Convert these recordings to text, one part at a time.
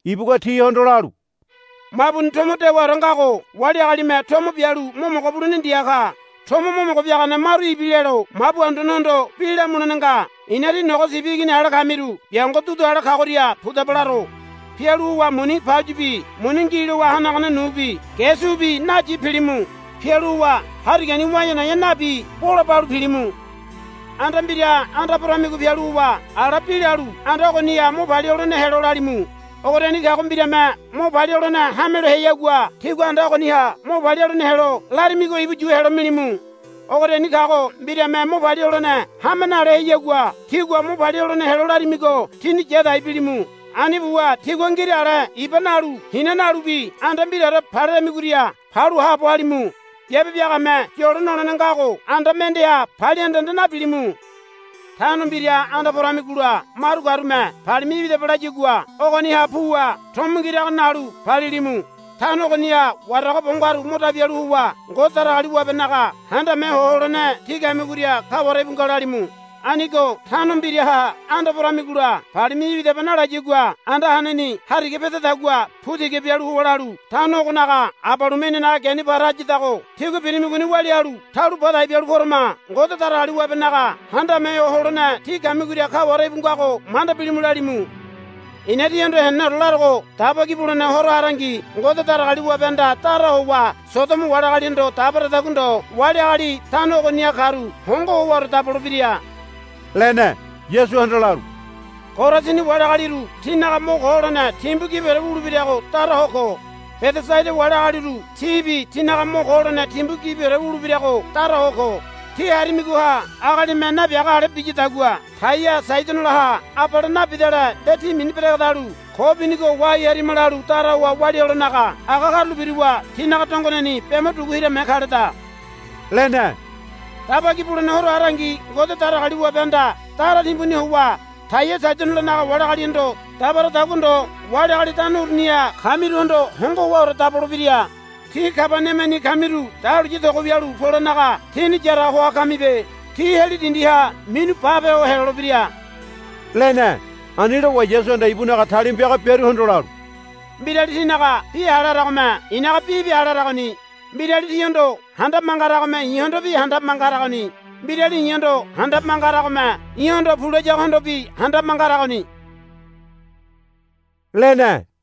ibugua tihondo lalu, Mabuni tomo dewaore ngago wali agalime tomo bialu mo mogo bulene ndia ka. Tomo mo mogo biagane maru ibilelo mabu anduanehondo bi lamulene nga. I̱na tí nogo sibi igini ale kamiru biango dudu ale kagoria pudaba laro. Pialu howa muni pauyibi muni ngi lowa hanagane nubi ge ge subi nayi pilimu. Pialu howa harigani wa̱e̱a na̱e̱a nabi bola balu pilimu. Anda mbiraha anda poramigo pialu howa ala bi lalu, Anda ogoniha mo palia holene helo, lalimu. Ogoriani kago mbirame mo palia holene hamelo heayagua tígua anda ogoniha mo palia holene helo larimigo ibu yu helo milimu. Ogoriani kago mbirame mo palia holene hame nale heayagua tígua mo palia holene helo larimigo tíni yadai bilimu. Ani buwa tigua ngira ale iba nalu hina nalubi anda mbiraore paleremigoria palu haabo halimu. Biabe biagame yolo nolene ngago. Anda mendeha palia anda anda nabilimu. Tano mbira anda poramigola maru karume, Palimi̱ya ibidaba, layagua ogoniha puwa tomo ngirago nalu palilimu. Tano ogoniha warago bo ngaru mo dabi halu howa, Ngode Datagaliwabenaga Handame Ho Holene tí kamigoria kaware íbu nga, lalimu. Anigo tano mbiraha anda poramigola, Palimi̱ya ibidaba, nalayagua anda haneni hariga pedadagua pu tiga bialu howa lalu, Tano ogonaga abalume inanaga geni para hayadago tígua birimigoni walia halu taulo badai bialu porama. Ngode Datagaliwabenaga Handame Ho Holene tí kamigoria kaware íbu ngago manda bilimu, lalimu. I̱na tíhondo heneneore larogo Daba Ki Bulene Horo harangi Ngode Datagaliwabehanda dara howa Sodomo wali agalihondo dabaradagua ndo wali agali tano ogoniha karu hongo howaore dabolebira, lene. Yasuhanda lalu, Korasini wali agaliru tínaga mo ko holene timbu gibiore wulebirago daraho ko. Bedesaida wali agaliru tíbi tínaga mo ko holene timbu gibiore wulebirago daraho ko. Tí harimigoha agalime nabiaga ale biyadagua Taia Saidonolaha abale bidale nde ti mini beregedalu ko binigo wahai harima lalu dara howa walia helonaga aga karulo biruwa tinaga dongoneni be mo dugu hirame kaleda, lene. Daba Ki Bulene Horo harangi Ngode Datagaliwabehanda dara timbuni howa Taia Saidonolanaga wali agalihondo dabaradagua ndo wali agali tano uruniha kamiruhondo hongo howaore dabolebira. Tí Kabaniamani kamiru dahuliya togo wialu polenaga tíni yaraga hoa kamibe. Tí heli dindiha minu bape ho helolebira, lene. Ani lowa Yasuhanda ibunaga talima piaga biaruhondo lalu, Mbirali tínaga bi hale haragome i̱naga bibi hale haragoni. Mbirali tíhondo handabe manga haragome i̱hondobi handabe manga haragoni. Mbirali i̱hondo handabe manga haragome i̱hondo, Pu, layagohondobi handabe manga haragoni, lene.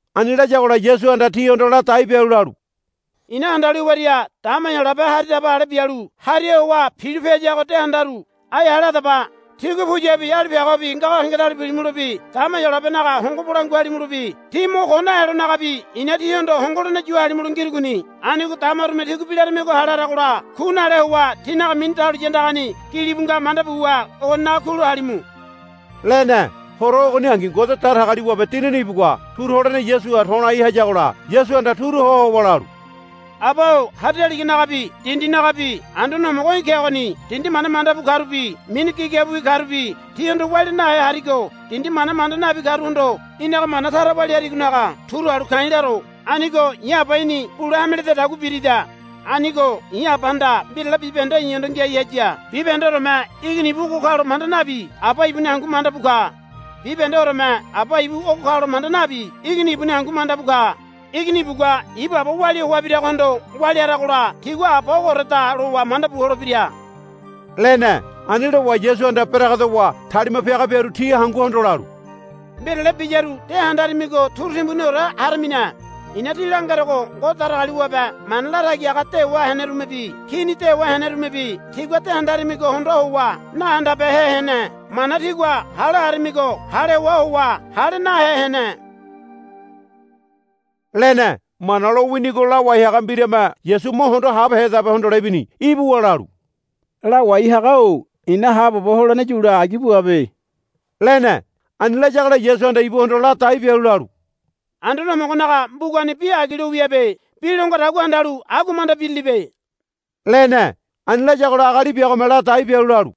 Ani layagola Yasuhanda tihondo ladai bialu lalu, I̱na handalu hewaria dama Heyolabe hari daba ale bialu hariha howa pilope hayago de handaru. Ai hale hadaba. Tígua puyabi alipiagobi ngago hengedalu pilimulobi dama Heyolabenaga hongo bolangua halimulobi tí mo ko nahelonagabi i̱na tíhondo hongo holene yu halimulo ngirugoni. Anigo damarume tígua bi larimigo hale haragola ku nale howa tínaga mini dahuliya andagani gilibu nga manda buwa ogoninaga kulo halimu, lene. Horo ogoningi Ngode Datagaliwabe Dinini ibugua turu holene Yasuha to̱lai hayagola Yasuhanda turu ho howa lalu, Aba-o hari daliganagabi dindinagabi Anduane Homogo í̠ kegoni. Dindi mana manda bu karubi mini gigabiwi karubi tihondo walia nahe harigo dindi mana manda nabi karuhondo í̠naga mana tara walia harigonaga turu halu ka̱i̱ laro. Anigo i̱ Aba í̠ni bule hame lededagua birida. Anigo i̱ Abahanda mbirale bibahende i̱hondo ngiai haya. Bibahendeoreme Igini ibu ogo kalo manda nabi Aba ibuni hangu manda bu ka. Bibahendeoreme Aba ibu ogo kalo manda nabi Igini ibuni hangu mandabu ka. Igini ibugua ibu Aba walia hoa biragohondo walia haragola tigua Aba ogooreda lowa mandabu holebira, lene. Ani lowa Yasuhanda beregedowa talima piaga biaru ti hanguhondo lalu, Mbirale biyaru de handaramigo turu timbuniore haramine. I̱na tí langerogo Ngode Datagaliwabe mana latagi haga dewa henerumebi kini dewa henerumebi tígua de handaramigo hondoa howa nahandabehe hene. Mana tígua hale haramigo hale hoa howa hale nahe hene, lene. Mana lowinigo lawai haga mbirame Yasu mo hondo habehedabe hondole ibini. Ibuwa lalu, Lawai haga-o i̱na haabobo holene yule agi buabe, lene. Ani layagola Yasuhanda ibuhondo ladai bialu lalu, Anduane Homogonaga mbugani bi agi lo wiabe. Bi lo ngadagua handalu agua manda birilibe, lene. Ani layagola agali biagome ladai bialu lalu,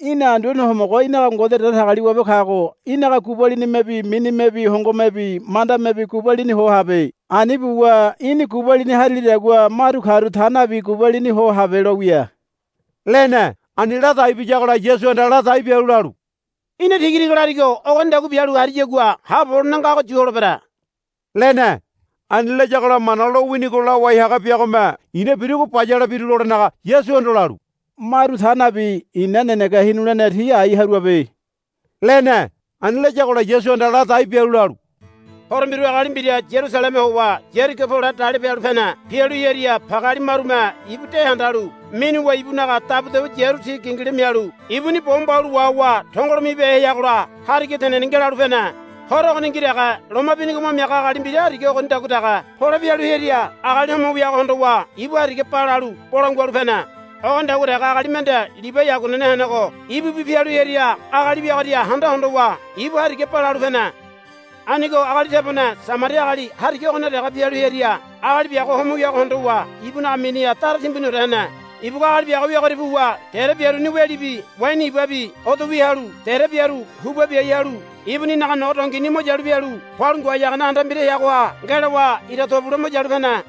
Í̠na Anduane Homogo í̠naga Ngode Datagaliwabe kago í̠naga gubalinimebi minimebi hongomebi mandamebi gubalini ho habe. Ani buwa í̠ni gubalini harilidagua maru karu ta nabi gubalini ho habe lo wia, lene. Ani ladai biyagola Yasuhanda ladai bialu lalu, Í̠na tigatiga larigo ogonidagua bialu hariyagua haabobo holene ngago yu holebere, lene. Ani layagola Mana lowinigo lawai haga biagome i̱na birugo bayale biru lolenaga Yasuhondo lalu, Maru ta nabi i̱na nenege hinulene ti ai haruabe, lene. Ani layagola Yasuhanda ladai bialu lalu, Horo mbiru agali mbira Yarusaleme howa Yarigo pole dalipe halu pene. Pialu hearia pageali marume ibu de handalu minuwa ibunaga dabudabu yiaru ti gingila mialu ibuni bo mbaulo wahowa tongolo mibehe heagola hariga teneni ngelalu pene. Horo ogoningi dege loma binigo mo miaga agali mbira hariga ogonidagua dege pole pialu hearia agali homo wiago hondowa ibu hariga balalu bolangua halu pene. Ogonidagua dege agali mende Libai aguanene henego ibubi pialu hearia agali wiagoria handa hondowa ibu hariga balalu pene. Anigo agali tebone Samaria agali hariga ogoniha dege pialu hearia agali biago homo wiago hondowa ibunaga miniha dara timbuniore hene. Ibugua agali biago wiagoria puwa dere biaruni welibi waini ibabi odo wia halu dere biaru huba biai halu ibuninaga nogo dongini mo yalu pialu palu ngoai hagane anda mbira heagoha ngelowa ira to bule mo yalu pene.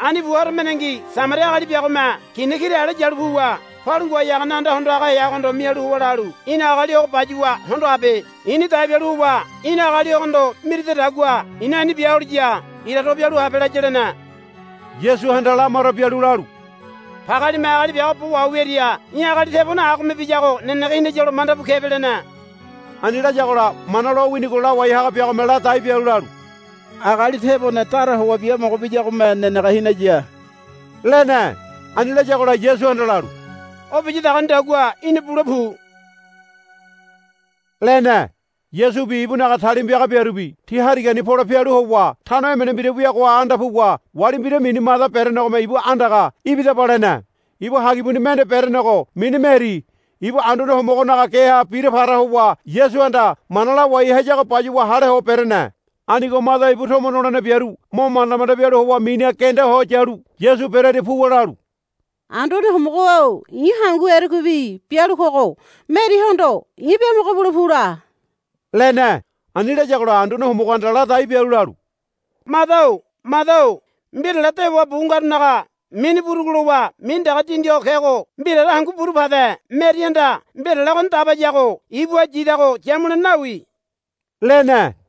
Ani buwa horo mendengi Samaria agali biagome kina kira ale yalu puwa palu ngoai hagane anda hondo haga heagohondo mialu howa lalu, Í̠na agali ogo bayuwa hondo habe. I̱ni dai bialu howa í̠na agali ogohondo miridadagua i̱na ani bia holiya ira to bialu habe, laya, lene. Yasuhanda lamaro bialu lalu, Pagealime agali biago bo waho wiaria í̠ agali tebone agome biyago nenege hinayalo mandabu kebe, lene. Ani layagola Mana lowinigo lawai haga biagome ladai bialu lalu, Agali tebone dara howa biamogo biyagome nenege hinaya, lene. Ani layagola Yasuhanda lalu, O biyadagonidagua í̠na bule pu, lene. Yasubi ibunaga talima piaga biarubi ti harigani pole pialu howa tano emene mbira wiagoha anda puwa wali mbira mini Mada berenegome ibu andaga, Ibidaba, lene. Ibu hagibuni mende berenego mini Meri ibu Anduane Homogonaga geha bira para howa Yasuhanda mana lawai hayago bayuwa hale ho berene. Anigo Mada ibu tomo nolene biaru mo manda manda bialu howa miniha genda ho yalu Yasu berearia puwa lalu, Anduane Homogo-o i̱ hangu erekuibi bialu kogo Merihondo í̠ biamogo bule pu la, lene. Ani layagola Anduane Homogohanda ladai bialu lalu, Mada-o Mada-o mbirale dewa bu ngarunaga mini burugu lowa mini dege dindi ho kego mbiraore hangu buru pade Merihanda mbirale ogoni dabayago ibuha yidago yamulene nawi, lene.